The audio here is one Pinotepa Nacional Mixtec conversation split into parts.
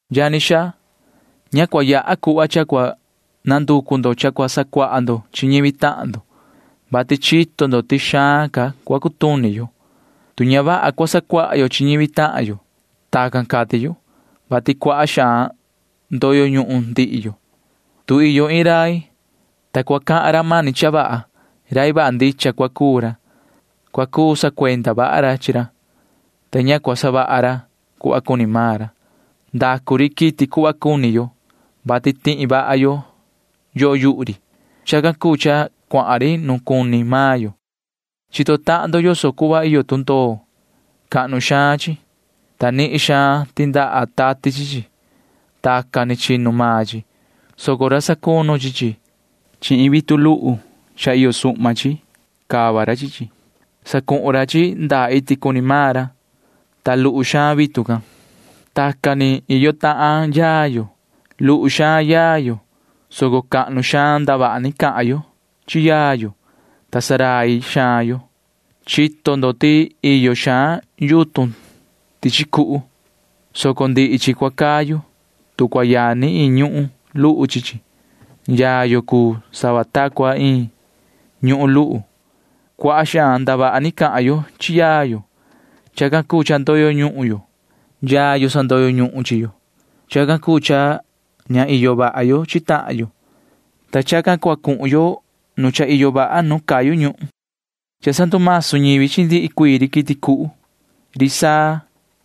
Yani xaa, ña cua yaha cuhva cha cua nanducu ndo cha cua sacuaha ndo chi ñivi tahan ndo, vati chito ndo ti xaan ca cua cutuni yo, tu ña vaha cua sacuaha yo chi ñivi tahan yo. Tacan cati yu, vati cuaha xaan ndoyo ñuhun ndihi yo. Tu iyo iin rai, ta cua cahan ra mani cha vaha, rai vaha ndicha cua cuu ra. Cua cuu sacuenda vaha ra chi ra, ta ña cua savaha ra cuhva cuni ni maan ra. Savaha ri quiti cuhva cuni maan yo, vati tihi vaha yo yoho yuhu ri. Chacan cuu cha cuahan ri nuun cuni maan yo. Chito tahan ndo yoso cuhva iyo tundoo. Cahnu xaan chi, ta nihin xaan yani tati chi chi. Tacan ni chinu maan chi, soco cua cava ra sacunu chi chi. Chi vitu luhu iyo suhma chi cava ra chi chi. Cava ra chi chi ndaa iti cuni maan ra, ta luhu xaan vitu can. Tacan ni iyo tahan yaa yo. Luhu xaan yaa yo, soco cahnu xaan ndavaha ni cahan yo chi yaa yo, ta ndurai xaan yo. Chito ndo ti iyo xaan yutun tichi cuhu, soco ndihi chi cua cayu, tu cua yani iin ñuhun luhu chi chi. Maan yaa yo cuu sava ta cua iin ñuhun luhu. Cuaha xaan ndavaha ni cahan yo chi yaa yo. Chacan cuu cha ndoyo ñuhun yo. Yaa yo sandoyo ñuhun chi yo. Chacan cuu cha ña iyo vaha yo chi tahan yo. Chacan ni savaha run cha iyo andaya nu cayu ñuhun. Cha sandumasu ñivi chi ndihi cuii ri quiti cuhu. Cha ndumasu ri saa.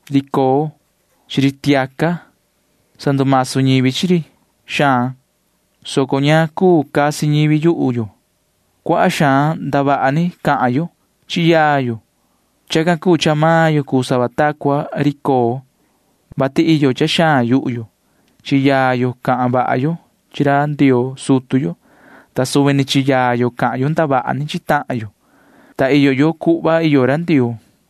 Cha ndumasu ri coo. Cha ndumasu ri tiaca. Sandumasu ñivi chi ri xaan, soco ña cuu casi ñivi yuhu yo. Cuaha xaan ndavaha ni cahan yo chi yaa yo. Chacan cuu cha maan yo cuu sava ta cua ri coo, vati iyo cha xaan yuhu yo. Chi yaa yo cahan vaha yo chi ra Ndioo sutu yo, ta suvi ni chi yaa yo cahan yo ndavaha ni chi tahan yo, ta iyo yo cuhva iyo ra Ndioo.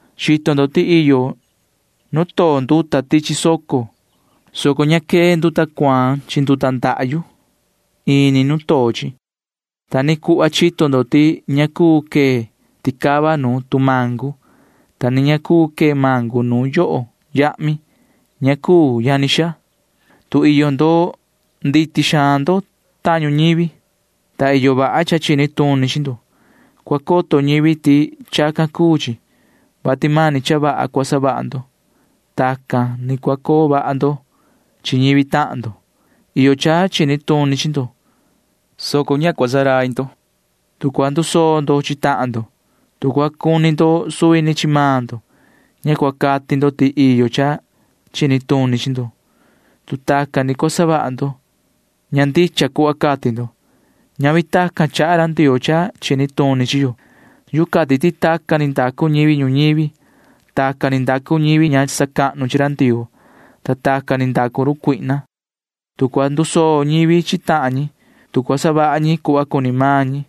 Chito ndo ti iyo nu too nduta tichi soco, soco ña quee nduta cuaan chi nduta ndahyu ini nu too chi. Ta ni cuhva chito ndo ti ña cuu cana chiti ticava nu tumangu, ta ni ña cuu cana chiti mangu nu yoho yahmi. Ña cuu, yani xaa. Tu tuhva vaha ndo, tu iyo cha chini tuni chi ndo, cua coto ñivi ti chacan cuu chi, vati mani cha vaha cua savaha ndo. Tacan ni cua coo vaha ndo chi ñivi tahan ndo. Iyo cha chini tuni chi ndo, soco ña cua ndurai ndo. Tu cua ndusoo ndo chi tahan ndo, tu cua cuni ndo suvi ni chi maan ndo, ña cua cati ndo ti iyo cha chini tuni chi ndo. Tu tacan cua savaha ndo, ña ndicha cuhva cati ndo. Ñavi tacan chaha ra Ndioo cha chini tuni chi yo. Yuhu cati ti tacan ni ndacu ñivi ñuñivi. Tacan ni ndacu ñivi ña sacahnu chi ra Ndioo, ta tacan ni ndacu run cuihna. Tu cua ndusoo ñivi chi tahan ñi, tu cua savaha ñi cuhva cuni maan ñi,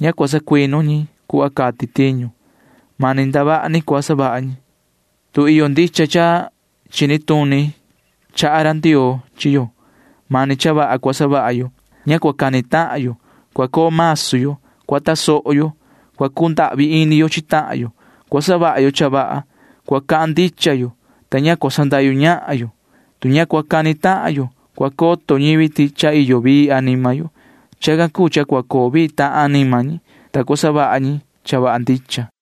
ña cua sacuinu ñi cuhva cati tiñu. Mani ndavaha ni cua savaha ñi. Tu iyo cha chini tuni ndicha cha chaha ra Ndioo chi yo, mani cha vaha cua savaha yo. Ña cua cani tahan yo. Cua coo masu yo. Cua tasoho yo. Cua cundahvi ini yo chi tahan yo. Cua savaha yo cha vaha. Cua cahan ndicha yo, ta ña cua sandahyu ñahan yo. Tu ña cua cani tahan yo, cua coto ñivi ti cha iyo vii anima yo. Chacan cuu cha cua coo vii tahan anima ñi, ta cua savaha ñi cha vaha ndicha.